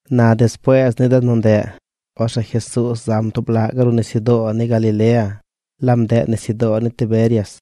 Na despuees ni de nu ndeꞌ, orzeꞌ Jesuuz zam tub laꞌ gaꞌ ruꞌ nisyudoo ni Galilea. Laab ndeꞌ nisyudoo ni Tiberias.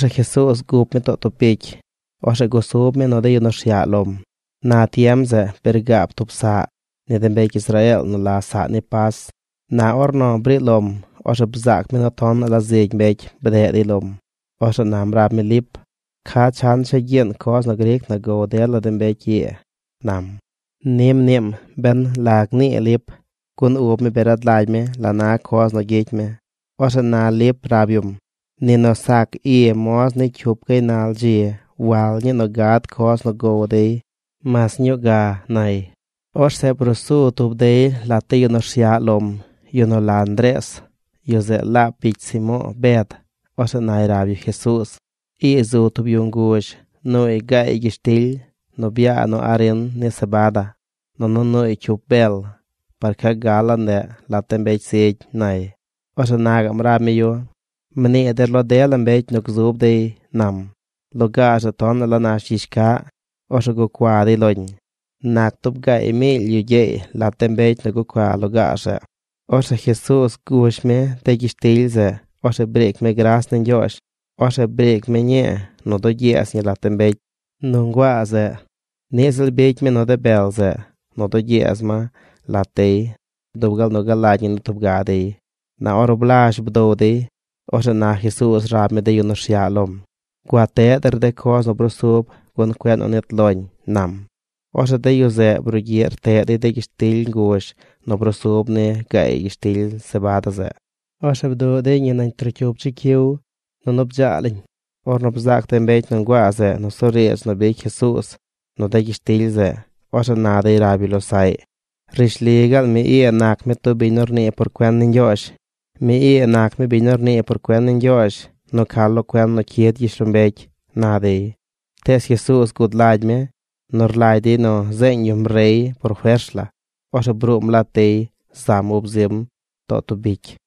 Orzeꞌ Jesuuz gup mi too tub bicy. Orzeꞌ gusub mi nu de yu nu rsyaꞌ lom. Na tiem zeꞌ bi rgaab tub saꞌ ni de mbecy Israeel nu la saꞌ ni Pas. Na ornu briꞌ lom, orzeꞌ bzaac mi nu tonaꞌ la zigy mbecy bdeꞌ dey lom. Orzeꞌ nam rab mi Lip: ―¿Ca chan cha gyiin coz nu gric na gow dela de mbecy ii? ―nam. Ni mniim ben la gnii Lip, gun ub mi bi rad lagy mi la na coz nu gyicy mi. Orzeꞌ na Lip rab yum: ―Ni nu sac i moz ni cyup gaynal dzi wal ñii nu gad coz nu gow dey mas ñuu ga ―nay. Orzeꞌ brusu tub dey lat de yu nu rsyaꞌ lom, yu nu la Ndrees, yu zeꞌ laab bicy Simo̱o̱ Bed. Orzeꞌ nay rab yu Jesuuz: ―Ii zu tub yu nguzh nuuy gaay gyishtily nu byaa nu arin ni sebada, nunu nuuy cyup bel. ¿Par ca gal laa ndeꞌ lat de mbecy zigy? ―nay. Orzeꞌ na gaꞌm rab mi yu: ―Mnii der lo dela mbecy nu gzub dey ―nam. Lugaar zeꞌ tonaꞌ la nash gyizh caꞌ. Orzeꞌ gucua dey loñ. Nac tub gaay miily yu gyeey lat de mbecy nu gucua lugaar zeꞌ. Orzeꞌ Jesuuz gush mi de gyishtily zeꞌ. Orzeꞌ briic mi gras ni Ñgyoozh. Orzeꞌ briic mi ñii nu dugyeez ñi lat de mbecy nu nguaa zeꞌ. Niꞌ ziꞌl bicy mi nu de bel zeꞌ nu dugyeez ma lat dey dub gal nu galagy ñi ni tub ga dey. Na ornu blazh bdow dey, orzeꞌ na Jesuuz rab mi de yu nu rsyaꞌ lom: ―Gua teꞌ der de coz nu brusub gun cueꞌ nu nit loñ ―nam. Orzeꞌ de yu zeꞌ brugyiꞌ rteꞌ dey de gyishtily nguzh nu brusub ni gaay gyishtily sebada zeꞌ. Orzeꞌ bduꞌ dey ñi nañ trocyup chicyiw nunu bdzaa lañ. Ornu bzaac de mbecy nu nguaa zeꞌ nusuriidz nu bicy Jesuuz nu de gyishtily zeꞌ, orzeꞌ na dey rab yu losaꞌy: ―Rishli gaal mi ii nac mi tub biñ nu rnii por cuen ni Ñgyoozh. Mi ii nac mi biñ nu rnii por cuen ni Ñgyoozh nu ca lo cuen nu cyid gyishlombecy ―na dey. Tees Jesuuz gud lagy mi nu rlagy dey nu zeeñ yum rey por fers la. Orzeꞌ bruum lat dey zam ub zim too tub bicy.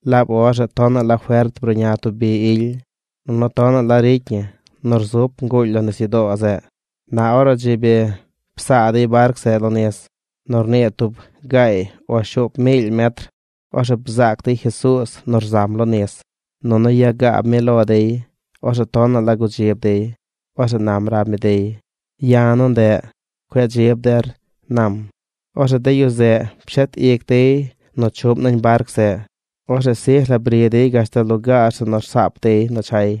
Laab or zeꞌ tonaꞌ la fert bruꞌña tub bi ily, nunu tonaꞌ la ricy ñi nu rzup nguuly lo nisyudoo zeꞌ. Na ornu dzi bi psaa dey barc zeꞌ lo nis nu rnii tub gaay o shuup miily metr, orzeꞌ bzaac dey Jesuuz nu rzam lo nis, nunu yagaab mi lo dey. Orzeꞌ tonaꞌ la gudzib dey. Orzeꞌ nam rab mi dey: ―¡Ya̱ nu ndeꞌ! ¡Cueꞌ dzib der! ―nam. Orzeꞌ de yu zeꞌ pshet ic dey nu chuꞌm nañ barc zeꞌ. Orzeꞌ sij la bri dey gashtal lugaar zeꞌ nu rsaap dey chay.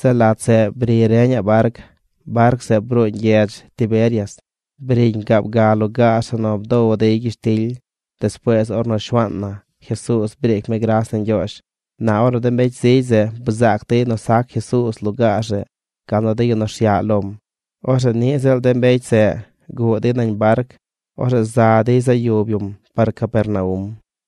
Zeꞌ lat zeꞌ bri reñaꞌ barc. Barc zeꞌ bruuñ gyedz Tiberias. Briñ gaab ga lugaar zeꞌ nu bdow dey gyishtily despuees ornu Shuaan na Jesuuz briic mi gras ni Ñgyoozh. Na ornu de mbecy zigy zeꞌ bzaac dey nu sac Jesuuz lugaar zeꞌ gal nu de yu nu rsyaꞌ lom, orzeꞌ niꞌ ziꞌl de mbecy zeꞌ guꞌ dey nañ barc. Orzeꞌ za dey za yub yum par Capernaum.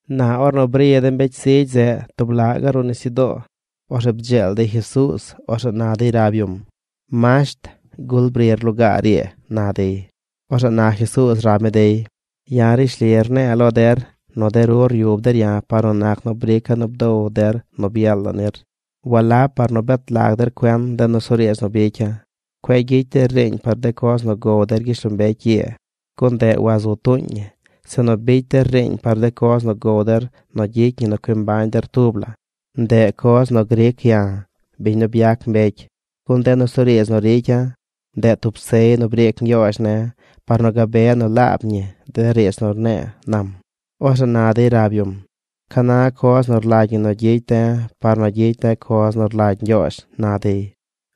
Na ornu bri de mbecy zigy zeꞌ tub laꞌ gaꞌ ruꞌ nisyudoo, orzeꞌ bdzeel dey Jesuuz. Orzeꞌ na dey rab yum: ―Masht, ¿gul brir lugaar ii? ―na dey. Orzeꞌ na Jesuuz rab mi dey: ―Ya̱ rishli rne̱e̱ lo der nu de ru ryub der ya̱ par nu nac nu brica̱ nu bdow der nu byel la nir. Walab par nu bet lag der cuen de nusuriidz nu bicya̱. Cueꞌ gyicy der riiñ par de coz nu gow der gyishlombecy ii, gun ndeꞌ wazu tuuñ ñi; sinu bicy der riiñ par de coz nu gow der nu gyicy ñi nu cui mbañ der tub la. Ndeꞌ coz nu gric ya̱, biñ nu byac mbecy. Gun de nusuriidz nu ricya̱, ndeꞌ tub sey nu briic Ñgyoozh ne̱ par nu gabe nu laab ñi de riidz nu rne̱e̱ ―nam. Orzeꞌ na dey rab yum: ―¿Ca na coz nu rlagy ñi nu gyicy de̱ par nu gyicy de̱ coz nu rlagy Ñgyoozh? ―na dey.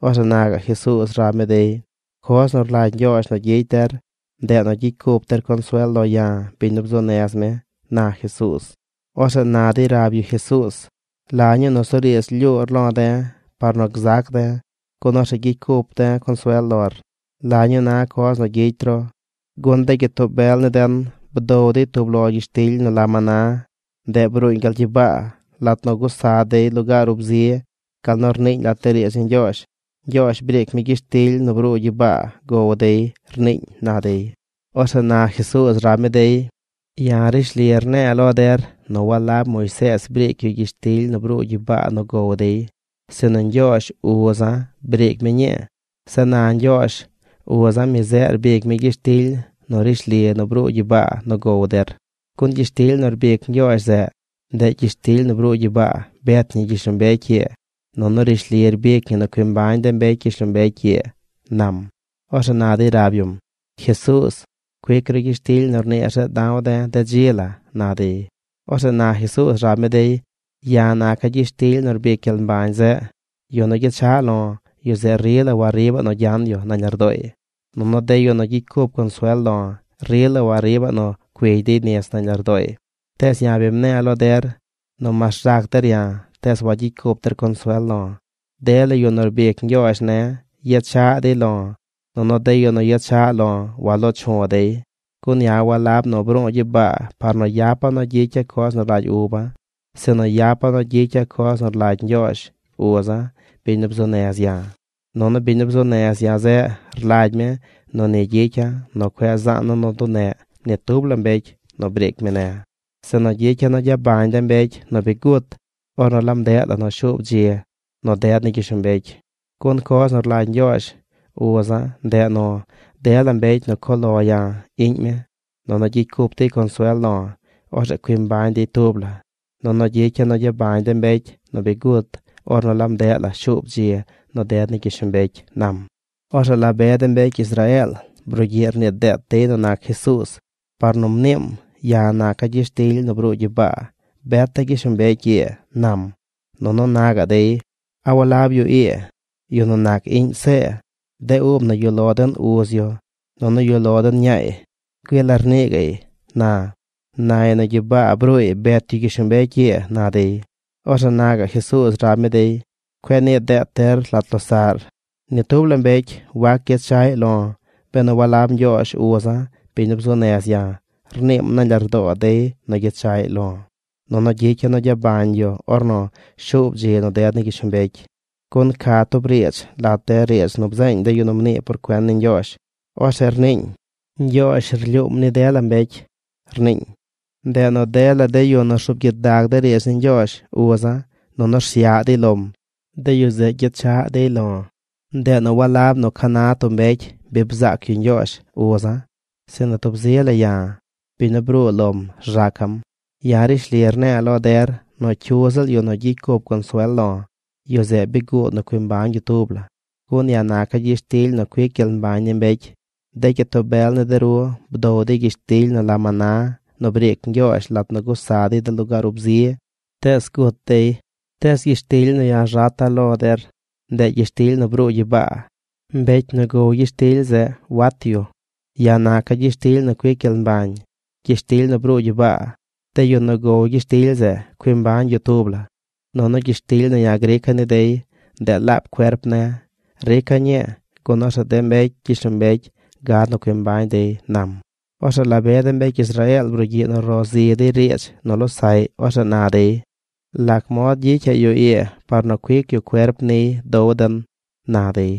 Orzeꞌ na gaꞌ Jesuuz rab mi dey: ―Coz nu rlagy Ñgyoozh nu gyicy der, ndeꞌ nu gyicy cup der consuel lo ya̱, biñ nu bzuu nez mi ―na Jesuuz. Orzeꞌ na dey rab yu Jesuuz: ―¿La ñuu nusuriidz lyuur lo̱ de̱ par nu gzac de̱, gun orzeꞌ gyicy cup de̱ consuel lor? ¿La ñuu na coz nu gyicy ru? Gun de gyitoo bel ni den bdow dey tub lo gyishtily nu la maná. Ndeꞌ bruuñ gal gyibaa lat nu gusa dey de lugaar ub zi, gal nu rniiñ lat riidz ni Ñgyoozh: “Ñgyoozh briic mi gyishtily nu bruu gyibaa gow dey”, rniiñ ―na dey. Orzeꞌ na Jesuuz rab mi dey: ―Ya̱ rishli rne̱e̱ lo der nu walab Moisees briic yu gyishtily nu bruu gyibaa nu gow dey, sinu Ñgyoozh, uza̱, briic mi ñii. Zeꞌ na Ñgyoozh, uza̱, mi zeꞌ rbic mi gyishtily nu rishli nu bruu gyibaa nu gow der. Gun gyishtily nu rbic Ñgyoozh zeꞌ, ndeꞌ gyishtily nu bruu gyibaa bet ñi gyishlombecy ii, nunu rishli rbic ñi nu cui mbañ de mbecy gyishlombecy ii ―nam. Orzeꞌ na dey rab yum: ―Jesuuz, cuic ru gyishtily nu rniir zeꞌ da̱w de̱ de dzi la ―na dey. Orzeꞌ na Jesuuz rab mi dey: ―Ya̱ naca̱ gyishtily nu rbic gyel mbañ zeꞌ. Yu nu gyechaꞌ lo̱, yu zeꞌ rila wariibaꞌ nu gyan yu nañ lardooy. Nunu de yu nu gyicy cup consuel lo̱ rila wariibaꞌ nu cuigy dey nis nañ lardooy. Tees ya̱ bi mne̱e̱ lo der nu mas rzac der ya̱, tees wayicy cup der consuel lo̱. Dela de yu nu rbic Ñgyoozh ne̱ yechaꞌ dey lo̱. Nunu de yu nu gyechaꞌ lo̱ walo̱o̱ chu̱ dey. Gun ya̱ walab nu bru̱u̱ gyibaa par nu yapa̱ nu gyicya̱ coz nu rlagy uba̱, sinu yapa̱ nu gyicya̱ coz nu rlagy Ñgyoozh, uza̱, biñ nu bzuu nez ya̱. Nunu biñ nu bzuu nez ya̱ zeꞌ rlagy mi nu ni gyicya̱ nu cueꞌ zaana̱ nu duneꞌ ni tub la mbecy nu briic mi ne̱, sinu gyicya̱ nu gyabañ de mbecy nu bi gut ornu laab ndeꞌ la nu shuub dzi nu ded ni gyishlombecy. Gun coz nu rlagy Ñgyoozh, uza̱, ndeꞌ nu dela mbecy nu cuꞌ lo ya̱, iꞌñ mi, nunu gyicy cup dey consuel lo̱, orzeꞌ cui mbañ dey tub la; nunu gyicya̱ nu gyabañ de mbecy nu bi gut ornu laab ndeꞌ la nu shuub dzi nu ded ni gyishlombecy ―nam. Orzeꞌ la be de mbecy Israeel brugyiꞌ rnii deet dey nu nac Jesuuz, par nu mniim: “Ya̱ naca̱ gyishtily nu bruu gyibaa beta̱ gyishlombecy ii”, nam. Nunu na gaꞌ dey: ―¿A walab yu ii, yu nu nac iꞌñ See? De ub na yuꞌ lo den uz yu, nunu yuꞌ lo den ñaay. Güii la rnii gaꞌy na. Nay nu gyibaa bruuy bet yu gyishlombecy ii ―na dey. Orzeꞌ na gaꞌ Jesuuz rab mi dey: ―Cueꞌ nii deet der lat losaꞌr. Ni tub la mbecy wac gyechaꞌ dey lo̱ benu walab Ñgyoozh uza̱ biñ nu bzuu nez ya̱, rniim nañ lardoo dey nu gyechaꞌy lo̱. Nunu gyicya̱ nu gyabañ yu ornu shuub dzi nu ded ni gyishlombecy. Gun ca tub riidz lat de riidz nu bzeeñ de yu nu mnii por cuen ni Ñgyoozh. Orzeꞌ rniiñ: “Ñgyoozh rlyuum ni dela mbecy”, rniiñ. Ndeꞌ nu dela de yu nu rzuub gyidag de riidz ni Ñgyoozh uza̱, nunu rsyaꞌ dey lom, de yu zeꞌ gyechaꞌ dey lo̱. ’Ndeꞌ nu walab nu ca na tub mbecy bi bzaac yu Ñgyoozh uza̱; sinu tub zi la ya̱, biñ nu bruu lom rzaca̱m. Ya̱ rishli rne̱e̱ lo der nu cyu ziꞌl yu nu gyicy cup consuel lo̱, yu zeꞌ bi guud nu cui mbañ yu tub la. Gun ya̱ naca̱ gyishtily nu cuic gyel mbañ ni mbecy. De gyitoo bel ni de ru bdow dey gyishtily nu la maná nu briic Ñgyoozh lat nu gusa dey de lugaar ub zi, tees gut dey. Tees gyishtily nu ya̱ rzata̱ lo der, ndeꞌ gyishtily nu bruu gyibaa. Mbecy nu gow gyishtily zeꞌ wat yu. Ya̱ naca̱ gyishtily nu cuic gyel mbañ: gyishtily nu bruu gyibaa. De yu nu gow gyishtily zeꞌ, cui mbañ yu tub la, nunu gyishtily nu ya̱ grica̱ ni dey, ndeꞌ laab cuerp ne̱. Rica̱ ñii, gun orzeꞌ de mbecy gyishlombecy gad nu cui mbañ dey ―nam. Orzeꞌ la be de mbecy Israeel brugyiꞌ nu ro zi dey riidz nu losaꞌy. Orzeꞌ na dey: ―¿Lac mod gyicyaꞌ yu ii par nu cuic yu cuerp niy dow den? ―na dey.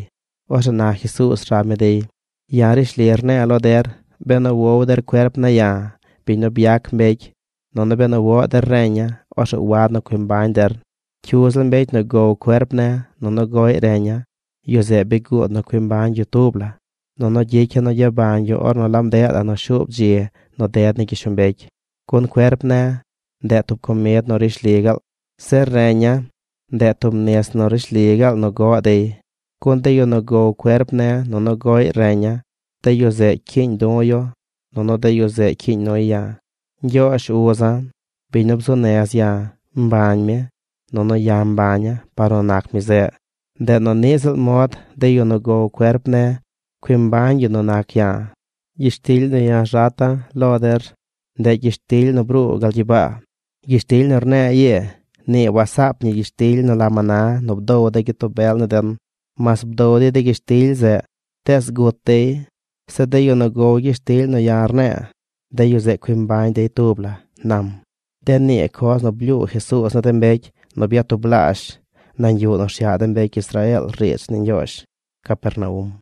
Orzeꞌ na Jesuuz rab mi dey: ―Ya̱ rishli rne̱e̱ lo der benu wow der cuerp ne̱ ya̱, biñ nu byac mbecy, nunu benu woꞌ der reña̱, orzeꞌ wad nu cui mbañ der. Cyu ziꞌl mbecy nu gow cuerp ne̱ nunu goꞌy reña̱, yu zeꞌ bi guud nu cui mbañ yu tub la, nunu gyicya̱ nu gyabañ yu ornu laab ndeꞌ la nu shuub dzi nu ded ni gyishlombecy. Gun cuerp ne̱, ndeꞌ tub comid nu rishli gaal. Zeꞌ reña̱, ndeꞌ tub nis nu rishli gaal nu goꞌ dey. Gun de yu nu gow cuerp ne̱ nunu goꞌy reña̱, de yu zeꞌ cyiiñ du̱ yu, nunu de yu zeꞌ cyiiñ nuy ya̱. Ñgyoozh uza̱, biñ nu bzuu nez ya̱, mbañ mi, nunu ya̱ mbaña̱ par nu nac mi zeꞌ. Ndeꞌ nu niꞌ ziꞌl mod de yu nu gow cuerp ne̱, cui mbañ yu nu nac ya̱. Gyishtily nu ya̱ rzata̱ lo der, ndeꞌ gyishtily nu bruu gal gyibaa. Gyishtily nu rne̱e̱ ii, nii wasaap ñi gyishtily nu la maná nu bdow de gyitoo bel ni den. Mas bdow dey de gyishtily zeꞌ, tees gut dey. Zeꞌ de yu nu gow gyishtily nu ya̱ rne̱e̱, de yu zeꞌ cui mbañ dey tub la ―nam. De nii coz nu blyuu Jesuuz ni de mbecy nu byatublaazh nañ yuꞌ nu rsyaꞌ de mbecy Israeel riidz ni Ñgyoozh Capernaum.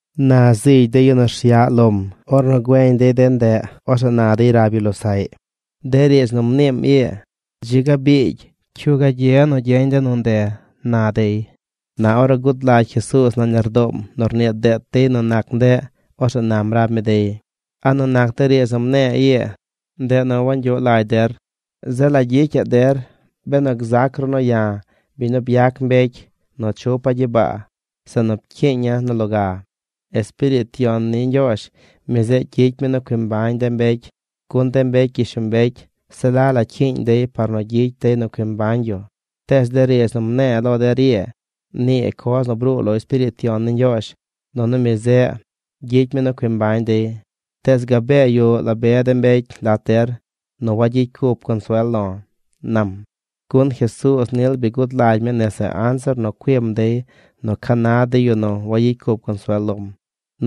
Na zigy de yu nu rsyaꞌ lom, ornu güeñ dey de ndeꞌ, orzeꞌ na dey rab yu losaꞌy: ―De riidz nu mniim ii, dzi ga biigy. ¿Cyu gagye nu gyeñ de nu nde? ―na dey. Na ornu gud lagy Jesuuz nañ lardoom nu rnii deet dey nu nac ndeꞌ, orzeꞌ nam rab mi dey: ―¿A nu nac de riidz nu mne̱e̱ ii, ndeꞌ nu wangyuꞌ lagy der? ¿Zeꞌ la gyicyaꞌ der benu gzac ru nu ya̱, biñ nu byac mbecy, nu chupa̱ gyibaa, zeꞌ nu pcyiiña̱ nu loga? Espiriit Yon ni Ñgyoozh, mi zeꞌ gyicy mi nu cui mbañ de mbecy gun de mbecy gyishlombecy se la la cyiiñ dey par nu gyicy dey nu cui mbañ yu. Tees de riidz nu mne̱e̱ lo der ii, nii coz nu bruu lo Espiriit Yon ni Ñgyoozh. Nunu mi zeꞌ gyicy mi nu cui mbañ dey. Tees gabee yuꞌ la be mbecy lat der nu wagyicy cup consuel lo̱ ―nam. Gun Jesuuz nil bi gud lagy mi nese anzir nu cuim dey nu ca na de yu nu wayicy cup consuel lom,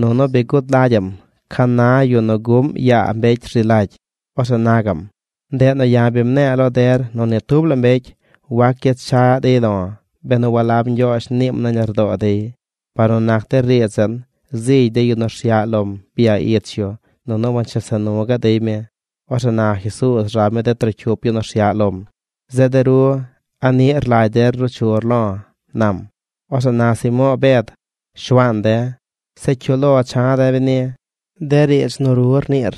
nunu bi gud lagyaꞌm ca na yu nu guꞌm yaa mbecy rzi lagy. Orzeꞌ na gaꞌm: ―Ndeꞌ nu ya̱ bi mne̱e̱ lo der nu ni tub la mbecy wac gyechaꞌ dey lo̱, benu walab Ñgyoozh niim nañ lardoo dey. Par nu nac de riidz zeꞌ, zigy de yu nu rsyaꞌ lom bya ich yu nunu wanchesa nu gaꞌ dey mi. Orzeꞌ na Jesuuz rab mi de trocyup yu nu rsyaꞌ lom: ―Zeꞌ de ru, ¿a niꞌ rlagy der ruu chur lo̱? ―nam. Orzeꞌ na Simo̱o̱ Bed: ―Shuaan de̱, ¿zeꞌ cyu lo cha̱ de̱ beni? De riidz nu ru rniir,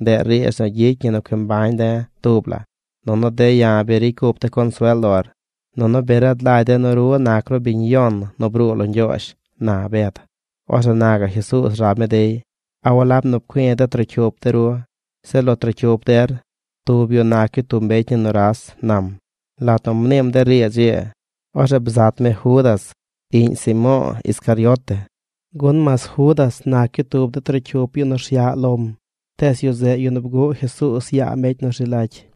ndeꞌ riidz nu gyicy ñi nu cui mbañ de̱ tub la. Nunu de̱ ya̱ bi ricy cup de̱ consuel lor, nunu bi rad lagy de̱ nu ru nac ru biñ yon nu bruu lo Ñgyoozh ―na Bed. Orzeꞌ na gaꞌ Jesuuz rab mi dey: ―¿A walab nu pcui̱ de trocyup de ru? Zeꞌ lo trocyup der, tub yu nac yu tub mbecy ni nuras ―nam. Lat nu mniim de riidz ii, orzeꞌ bzat mi Judas, iꞌñ Simo̱o̱ Iscariote, gun mas Judas nac yu tub de trocyup yu nu rsyaꞌ lom, tees yu zeꞌ yu nu bguꞌ Jesuuz yaa mbecy nu rzi lagy.